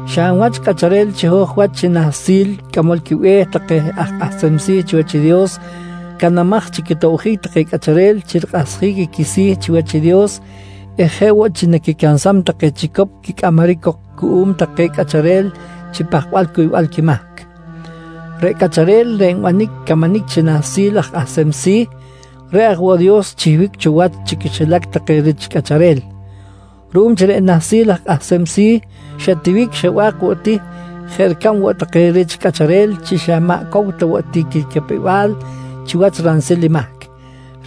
Xa hab wach cꞌacharel chiho̱j wach chi Nahsil Cꞌamol quiBe̱h take aj kꞌahsem si̱ chiwach i Dios canamaj chi quitobjic take cꞌacharel chi rikꞌahsjic i quisi̱ chiwach i Dios eh jeꞌ woꞌ chi naquicansam take chicop quicꞌamaric cok cuꞌum take cꞌacharel chi pahkbal cuybal quimahc. Reꞌ cꞌacharel reꞌ nbanic camanic chi Nahsil aj Kꞌahsem Si̱, reꞌ aj woꞌ Dios xchihbic cho wach chi quixilac take rich cꞌacharel. Ruꞌum chi reꞌ Nahsil aj Kꞌahsem Si̱ xa tiwic xa ba̱k woꞌ ti jeꞌ ricab woꞌ take rich cꞌacharel chi xa maꞌ cow ta woꞌ ti quicapew-bal chiwach ransil i mahc,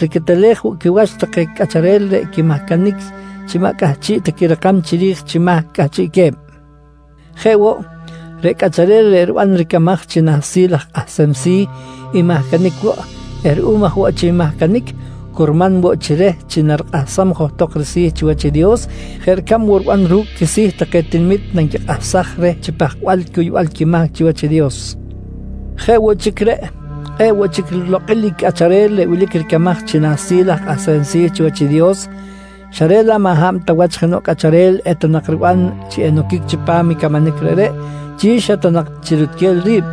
riquetelej woꞌ quiwach take cꞌacharel reꞌ quimahcanic chi maꞌ cꞌahchiꞌ ta quirakam chiri̱j chi mahc cꞌahchiꞌque̱b. Jeꞌ woꞌ, reꞌ cꞌacharel reꞌ riban ricamaj chi Nahsil aj Kꞌahsem Si̱ nmahcanic woꞌ eh ruꞌum aj woꞌ chi nmahcanic, curman woꞌ chi reh chi rikꞌahsaj johtok risi̱ chiwach i Dios jeꞌ ricab woꞌ riban ru̱cꞌ quisi̱ take tinamit nanquikꞌahsaj reh chi pahkbal cuybal quimahc chiwach i Dios. Jeꞌ woꞌ chic reꞌ, kꞌe̱ꞌ woꞌ chic lo̱kꞌ rilokꞌil i cꞌacharel reꞌ wilic ricamaj chi Nahsil aj Kꞌahsem Si̱ chiwach i Dios, xa reꞌ laꞌ maꞌ hab ta wach jenoꞌ cꞌacharel eta nak riban chi enoquic chipam i camanic reꞌreꞌ chi xa ta nak chi rutquel ri̱b,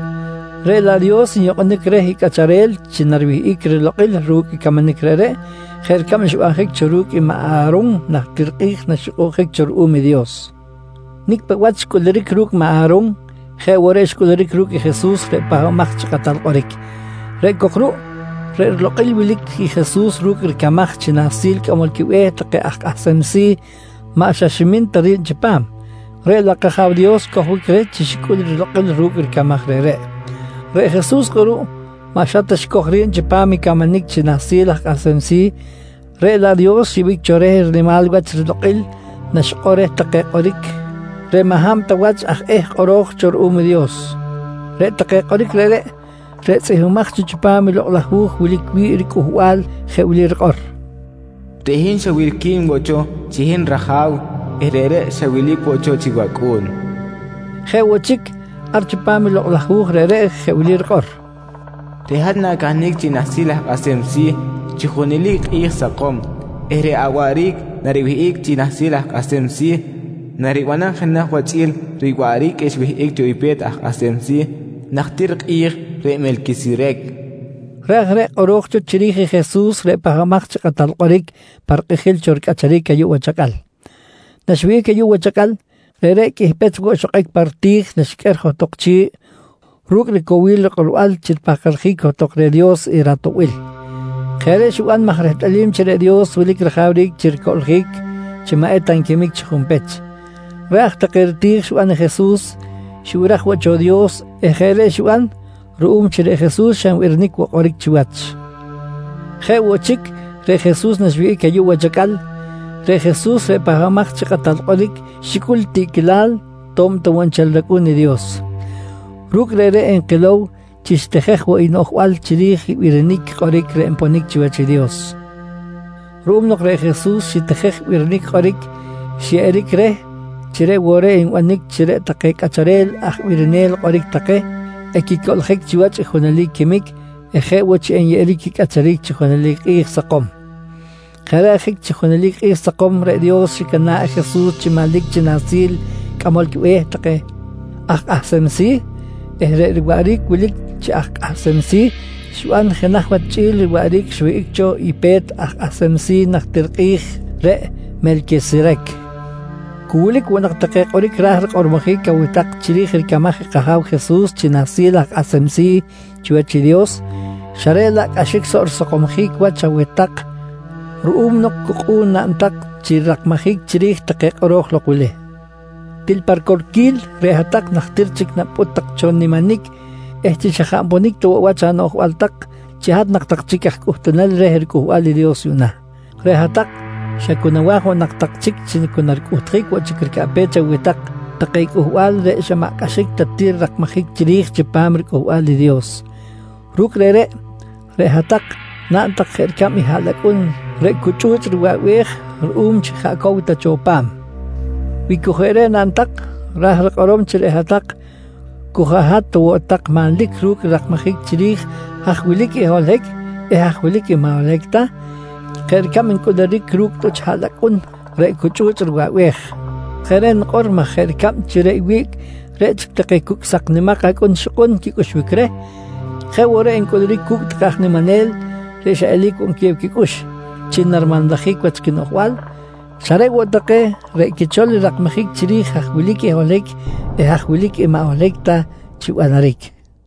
reꞌ laꞌ Dios nyukꞌunic reh i cꞌacharel chi nariwihꞌic rilokꞌil ru̱cꞌ i camanic reꞌreꞌ jeꞌ ricab xbanjic cho ru̱cꞌ i maꞌ A̱ron najtir kꞌi̱j naxyukꞌunjic cho ruꞌum i Dios. Nicꞌ paꞌ wach xcꞌuluric ru̱cꞌ maꞌ A̱ron jeꞌ woꞌ reꞌ xcꞌuluric ru̱cꞌ i Jesus reꞌ Pahbamaj chi Kꞌatal Kꞌoric. Reꞌ cok ruꞌ, reꞌ rilokꞌil wilic i Jesus ru̱cꞌ ricamaj chi Nahsil Cꞌamol quiBe̱h take aj Kꞌahsem Si̱ maꞌ xa ta ximin ta ri̱b chipam, reꞌ laꞌ kAja̱w Dios xcojbic reh chi xicꞌul i rilokꞌil ru̱cꞌ ricamaj reꞌreꞌ. Reꞌ Jesus kꞌuruꞌ maꞌ xa ta xicoj cho ri̱b chipam i camanic chi Nahsil aj Kꞌahsem Si̱, reꞌ laꞌ Dios xyeꞌbic cho reh i rinimal wach rilokꞌil naxikꞌor reh take kꞌoric reꞌ maꞌ hab ta wach aj eh kꞌoro̱j cho ruꞌum i Dios. Reꞌ take kꞌoric reꞌreꞌ, reꞌ tzꞌihmbimaj cho chipam i Lokꞌ laj Hu̱j wilic wi̱ꞌ i riCꞌuhbal, jeꞌ wili rikꞌor: “Reꞌ hin xa wilqui̱n woꞌ cho chi hin raja̱w eh reꞌreꞌ xa wilic woꞌ cho chi wacꞌu̱n, nqui. Jeꞌ woꞌ chic, ar chipam i lokꞌ laj hu̱j reꞌreꞌ jeꞌ wili rikꞌor: “Reꞌ hat na̱cahnic chi Nahsil Aj Kꞌahsem Si̱ chi junelic kꞌi̱j sakom eh reꞌ awaꞌric nariwihꞌic chi Nahsil aj Kꞌahsem Si̱ naribanam jenaj wach chꞌi̱l riwaꞌric xwihꞌic cho i Pe̱t Aj Kꞌahsem Si̱ najtir kꞌi̱j reꞌ Melquiserec, nqui rikꞌor. Reꞌ aj reꞌ i kꞌoro̱j cho chiri̱j i Jesus reꞌ Pahbamaj chi Kꞌatal Kꞌoric pa rikꞌijil cho ricꞌacharic ayuꞌ wach acꞌal. Naxwihꞌic ayuꞌ wach acꞌal, reꞌreꞌ qꞌuih pech woꞌ xokꞌic pa riti̱j naxiqꞌuer johtok chi̱ꞌ ru̱cꞌ ricowil rikꞌorbal chi ripahkaljic johtok reh Dios i ratoꞌbil. Jeꞌ reꞌ xiban maj rehtꞌalim chi reꞌ Dios wilic rajawric chi ricoꞌljic chi maꞌ eta nquimic chi junpech. Reꞌ aj take riti̱j xiban i Jesus, xibiraj woꞌ cho i Dios eh jeꞌ reꞌ xiban ruꞌum chi reꞌ Jesus xa nbirinic woꞌ kꞌoric chiwach. Jeꞌ woꞌ chic reꞌ Jesus naxwihꞌic ayuꞌ wach acꞌal, reꞌ Jesus reꞌ Pahbamaj chi Kꞌatal Kꞌoric xicꞌul tiꞌquilal to̱b ta woꞌ nchel rAcꞌu̱n i Dios. Ru̱cꞌ reꞌreꞌ nkilow chi xitijej woꞌ i noꞌjbal chiri̱j i birinic kꞌoric reꞌ nponic chiwach i Dios. Ruꞌum nok reꞌ Jesus xitijej birinic kꞌoric, xyeꞌeric reh chi reꞌ woꞌ reꞌ enbanic chi reꞌ take cꞌacharel aj birinel kꞌoric take, equicoꞌljic chiwach i junelic quimic eh jeꞌ woꞌ chi enyeꞌeric quicꞌacharic chi junelic kꞌi̱j sakom. Jeꞌ reꞌ ajic chi junelic kꞌi̱j sakom reꞌ Dios xicana̱ꞌ i Jesus chi manlic chi Nahsil Cꞌamol quiBe̱h take aj Kꞌahsem Si̱ eh reꞌ riwaꞌric wilic chi aj Kꞌahsem Si̱ xiban jenaj wach chꞌi̱l riwaꞌric xwihꞌic cho i Pe̱t aj Kꞌahsem Si̱ najtir kꞌi̱j reꞌ Melquiserec. Cu wilic woꞌ nak take kꞌoric ra̱j rikꞌormojic aweh tak chiri̱j ricamaj i kAja̱w Jesus chi Nahsil aj Kꞌahsem Si̱ chiwach i Dios, xa reꞌ laꞌ cꞌaxic soꞌ risakomsjic wach aweh tak ruꞌum nok cu kꞌu̱n naꞌn tak chi rirakmajic chiri̱j take kꞌoro̱j lok wili. Til pa ricorquil, reꞌ hat-tak najtir chic napꞌut tak cho niminic eh xa cu jaꞌ nponic ta woꞌ wach anoꞌjbal tak chi hat nak tak chic aj cꞌuhtunel reh riCꞌuhbal i Dios yuꞌna. Reꞌ hat-tak xa cu nawa̱j woꞌ nak tak chic chi cu naricꞌuhtjic woꞌ chic ricaꞌpech aweh tak take cꞌuhbal reꞌ xa maꞌ cꞌaxic ta ti rirakmajic chiri̱j chipam i riCꞌuhbal i Dios. Ru̱cꞌ reꞌreꞌ, reꞌ hat-tak naꞌn tak jeꞌ ricab i haꞌlacꞌun reꞌ cu chꞌu̱chꞌ riwaꞌbej ruꞌum chi jaꞌ cow ta cho pa̱m. Wi cu jeꞌ reꞌ naꞌn tak, ra̱j rikꞌorom chi reꞌ hat-tak cu jaꞌ hat ta woꞌ tak manlic ru̱cꞌ rirakmajic chiri̱j haj wilic i holohic eh haj wilic i maꞌ holohic ta, jeꞌ ricab ncꞌuluric ru̱cꞌ i tꞌuch haꞌlacꞌun reꞌ cu chꞌu̱chꞌ riwaꞌbej. Jeꞌ reꞌ nikꞌor maj jeꞌ ricab chi reꞌ wiꞌc reꞌ chic take cucꞌ sak nimak acꞌun ixkꞌun quicꞌuxbic reh, jeꞌ woꞌ reꞌ ncꞌuluric cu̱cꞌ take aj niminel reꞌ xa eli̱c woꞌ nquiyew quicꞌux chi narimanlajic wach quinoꞌjbal, xa reꞌ woꞌ take reꞌ quichol rirakmajic chiri̱j haj wilic i holohic eh haj wilic i maꞌ holohic ta chi banaric.